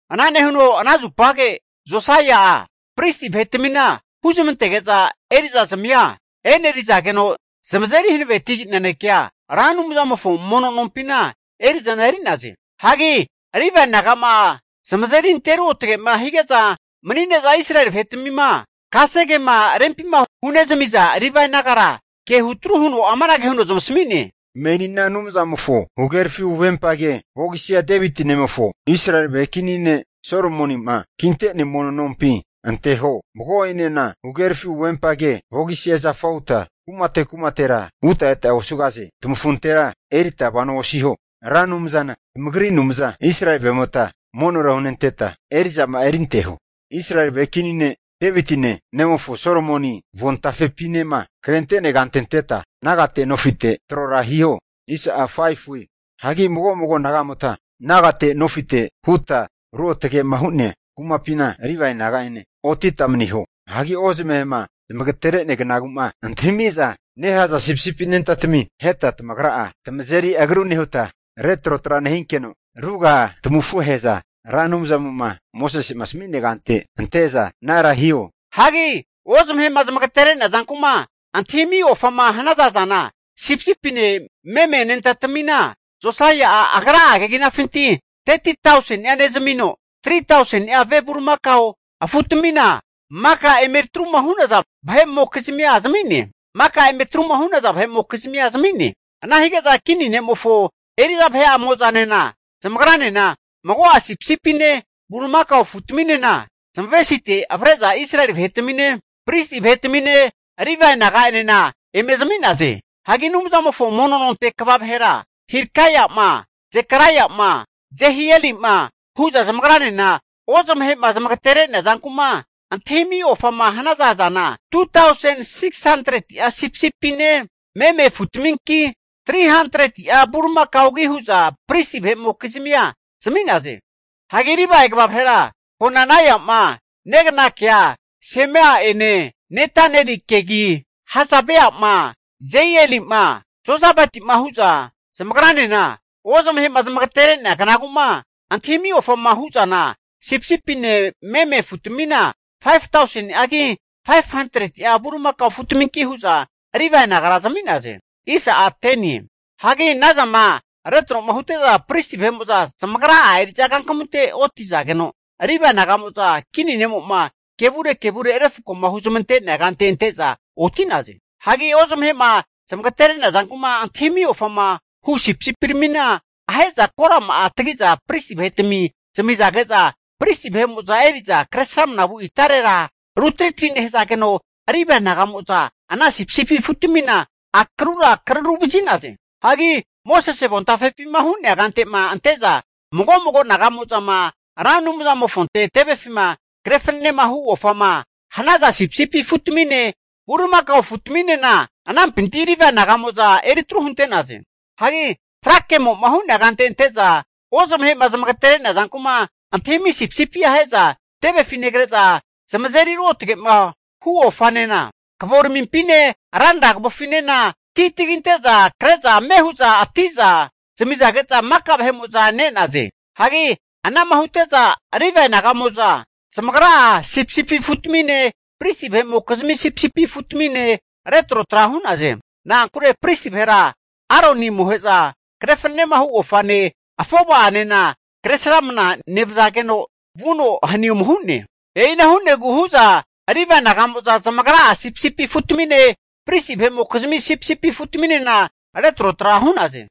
Ana nehuno ana zupage Josaia'a Pristi vahetmina huzmantege'za, eri'zazmia enerizageno zamazeri hanaveti nanekea zamasmige'za, Ra Anumzamofo mono nompina eri'zana eri'naze. Hagi Livae nagama zamazeri ante ruotage'ma hige'za mani'ne'za Israeli vahetmima kasegema rempima hunezmiza Livae nagara, ke hutru huno amanage huno zamasmi'ne, menina Anumzamofo huhagerafi huvempage vogisia Deviti nemofo Israeli vahe kini ne' Solomonima kinte'nea mono nompi anteho. Mago'enena huhagerafi huvempage vogisia zafa huta vuta eta osugahaze. Tamafuntera erita vano osiho. Ra Anumzana tamagri Anumza Israeli vahe'mota monora hunenteta eri'zama'a erinteho. Israeli vahe kini ne' Devitine, nemofo Solomoni avontafepinema, krente'nea kante anteta nagate nofite trora hiho. Hagi mago mago nagamota, nagate nofite huta ruotgema hu'nea kumapina Livae naga'ene otita maniho. Hagi Ozamahe'ma zamagatere'nea kanagu'ma antahimiza nehaza sipisipi anentatami, aheta tamagra'a tamazeri agru nehuta, retrotra nehinkeno ruga'a tamafuhe'za Ra Anumzamo'ma Mosesema asami'nea kante ante'za anara hiho. Hagi ozamahe'ma zamagatere'nea zanku'ma antahimi ofama hanaza zana, sipisipine meme anentatamina Josaia'a agra'a keginafintira 30tausenia nezmino, 3tauseni'a ve bulimakao afutamina maka eme atruma hu'naza vahe'mokizmia zami'ne. Ana hige'za kini ne'mofo eri'za vahe'amo'za zamagranena mago'a sipsipine bulimakao afutaminena zamavesite avre'za Israeli vahetamine, pristi vahetamine, Livae naga'enena eme zami'naze. Hagi Anumzamofo mono nonte kva vahera Hilkaia'ma, Zekaraia'ma, Jehieli'ma hu'za zamagranena ozamahe'ma zamagatere'nea zanku'ma antahimiza ofama hanaza zana, 2tausen 600'a sipisipine meme afutaminki, 300'a bulimakaogi hu'za pristi vahe'mokizmia zami'naze. Hagi Livae kva vahera Konanaia'ma, neganakea Semaia'ene Netanelikegi, Hasabaia'ma, Jeieli'ma, Jozabadi'ma hu'za zamagranena, ozamahema zamagatere'nea knaguma antahimi ofama huzana, sipisipine meme afutamina 5tauseni'agi, 500'a bulimakao afutminki hu'za Livae nagara zami'naze. Hagi ana zantmima retro'ma hute'za, pristi vahe'mo'za zamagra'a eri'za kankamunte oti'zageno, Livae naga'mo'za kini ne'mo'ma kevure kevure'ma refkoma huzmante'nea kante ante'za oti'naze. Hagi ozmahe'ma zamagatere'nea zanku'ma antahimiza ofama hu sipisipiramina ahe'za korama'a tagi'za pristi vahetami zamizage'za, pristi vahe'mo'za eri'za Kresramana vu itarera rutritri nehazageno, Livae naga'mo'za ana sipisipi afutamimofo akrura kararuvazi'naze. Hagi Mosese avontafepima hu'nea kante'ma ante'za mago mago naga'mo'zama Ra Anumzamofonte tevefima kre fananehu ofama hanaza sipisipi afutamine, bulimakao afutaminena anampinti Livae naga'mo'za eritru hunte'naze. Hagi tra kemoma hu'nea kante ante'za Ozmahe'ma zmagatere'nea zanku'ma antahimi sipisipia ahe'za tevefi negre'za, zamazeri ruotgema hu ofanena kavoramimpine ranra kavofinena ti taginte'za kre'za ame hu'za ati'za zamizage'za maka vahe'mo'za ne'naze. Hagi anama hute'za Livae naga'mo'za zamagra'a sipisipi afutamine, pristi vahe'mokizmi sipisipi afutamina retrotra hu'naze. Na'ankure pristi vahera, Aroni amohe'za kre fananemahu ofane, afova'anena Kresramana nevazageno vuno hani ome hu'ne. E'ina hu'negu hu'za Livae naga'mo'za zamagra'a sipisipi afutamine, pristi vahe'mokizmi sipisipi afutaminena retrotra hu'naze.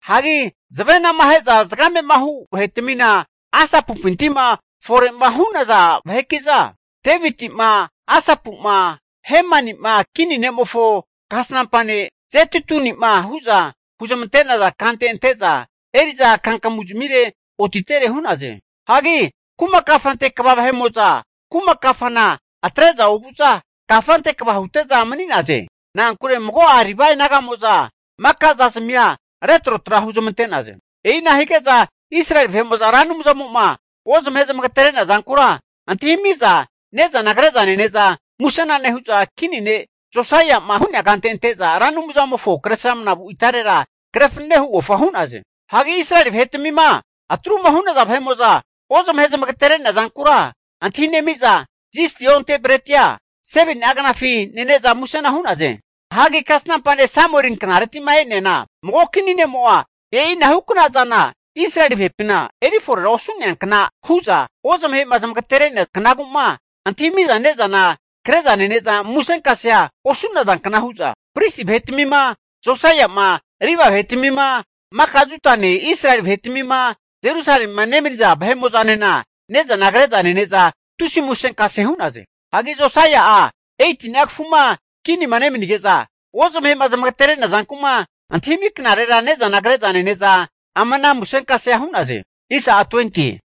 Hagi zavenama ahe'za zagame'ma hu vahetmina Asapumpinti'ma fore'ma hu'naza vaheki'za, Devitima Asapuma Hemanima kini ne'mofo kasnampa ne' Jedutuni'ma hu'za huzmante'naza kante ante'za eri'za kankamuzmire otitere hu'naze. Hagi kuma kafante kva vahe'mo'za, kuma kafana atre'za ovu'za kafante kva hute'za mani'naze. Na'ankure mago'a Livae naga'mo'za makazazmia retrotra huzmante'naze. E'ina hige'za Israeli vahe'mo'za Ra Anumzamo'ma ozmahe'ma zamagatere'nea zankura antahinemiza ne'zana kre'za nene'za musena nehu'za, kini ne' Josaia'ma hu'nea kante ante'za Ra Anumzamofo Kresramanavu itarera, kre fanane hu ofa hu'naze. Hagi Israeli vahe'tamima atru'ma hu'naza vahe'mo'za ozmahe'ma zamagatere'nea zankura antahinemi'za zisti onte bretia 7ni'a knafi nene'za musena hu'naze. Hagi kasnampa ne' Samueli knareti'ma e'neana mago kini ne'mo'a e'inahukna zana Israeli vahepina eri fore osu'nea kna hu'za, ozamahe'ma zamagatere'nea knaguma antahimi'za ne'zama kre'za nene'za musenkasea osu'nazankna hu'za pristi vahetmima, Josaia'ma Livae vahetmima, maka Judane Israeli vahetmima, Jerusalemima nemaniza vahe'mo'zanena ne'zana kre'za nene'za tusi musenkase hu'naze. Hagi Josaia'a 18ni'a kafuma kinima nemanige'za, ozmaheno zamagatere'nea zanku'ma antahimi knarera ne'zana kre'za nene'za ama ana musenkasea hu'naze.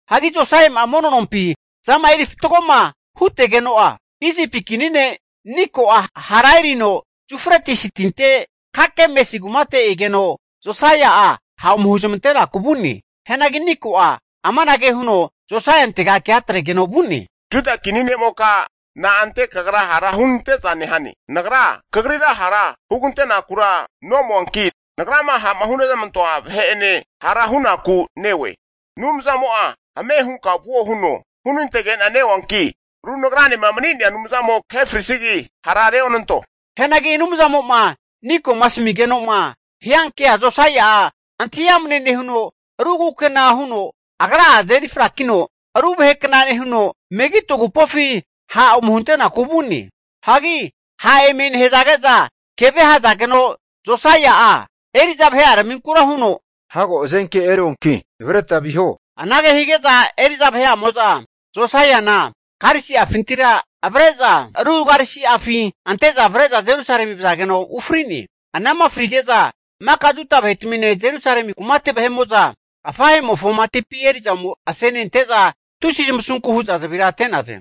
Hagi Josaia'ma mono nompi zama eri fatgoma hutegeno'a, Isipi kini ne' Niko'a hara erino Yufretisi Tinte Kakemisi kumate egeno, Josaia'a ha' ome huzmantenaku vu'ne. Hianagi Niko'a amanage huno Josaiantega kea atregeno vu'ne, Juda kini ne'moka, na'ante kagra hara hunante'za nehane? Nagra kagrira hara hugantenakura nomoanki, nagrama ha'ma hunezmantoa vahe'ene hara hunaku neoe. Anumzamo'a ame hunka vuo huno hunantegena neoanki, ru nagranema mani'nea Anumzamo kahe frisigi hara reonanto. Hianagi Anumzamo'ma Niko'ma asmigeno'ma hiankea Josaia'a antahi amne nehuno, ru kukena huno agra'a azeri frakino ru vahekna nehuno, Megido agupofi ha' ome hunaku vu'ne. Hagi ha' eme nehige'za, keve ahazageno Josaia'a eri'za vahe'araminkura huno, hago hazenke eruanki navreta viho. Anage hige'za eri'za vahe'amo'za Josai'ana karisi'afintira avre'za ru karisi'afi ante'za avre'za Jerusalemi vazageno ufri'ne. Anama frige'za, maka Juda vahetamine, Jerusalemi kumate vahe'mo'zanena afahe'mofo matipi eri'za ome asenente'za, tusi zamasunku hu'za zavira ate'naze.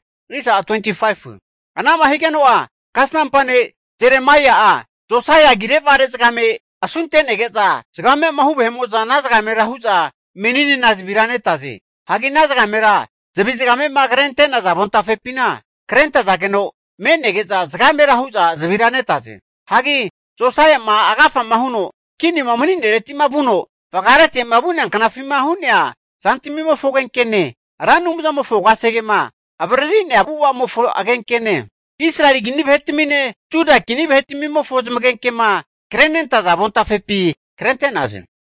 Ana'ma higeno'a, kasnampa ne' Jeremaia'a, Josaia agire vare zagame asunte'nege'za, zagamema hu vahe'mo'za ana zagamera hu'za meninena zavira netaze. Hagi ana zagamera zavi zagamema krenentaza avontafepina krentazageno me'nege'za zagamera hu'za zavira netaze. Hagi Josaia'ma agafama huno kinima mani'neretima vuno vagaretema vu'nea knafima hu'nea zantamimofo agenkene, Ra Anumzamofo kasegema avariri'nea avu'avamofo agenkenena, Israeli kini vahetamine Juda kini vahetmimofo zamagenke'ma krente'naza avontafepi krente'naze.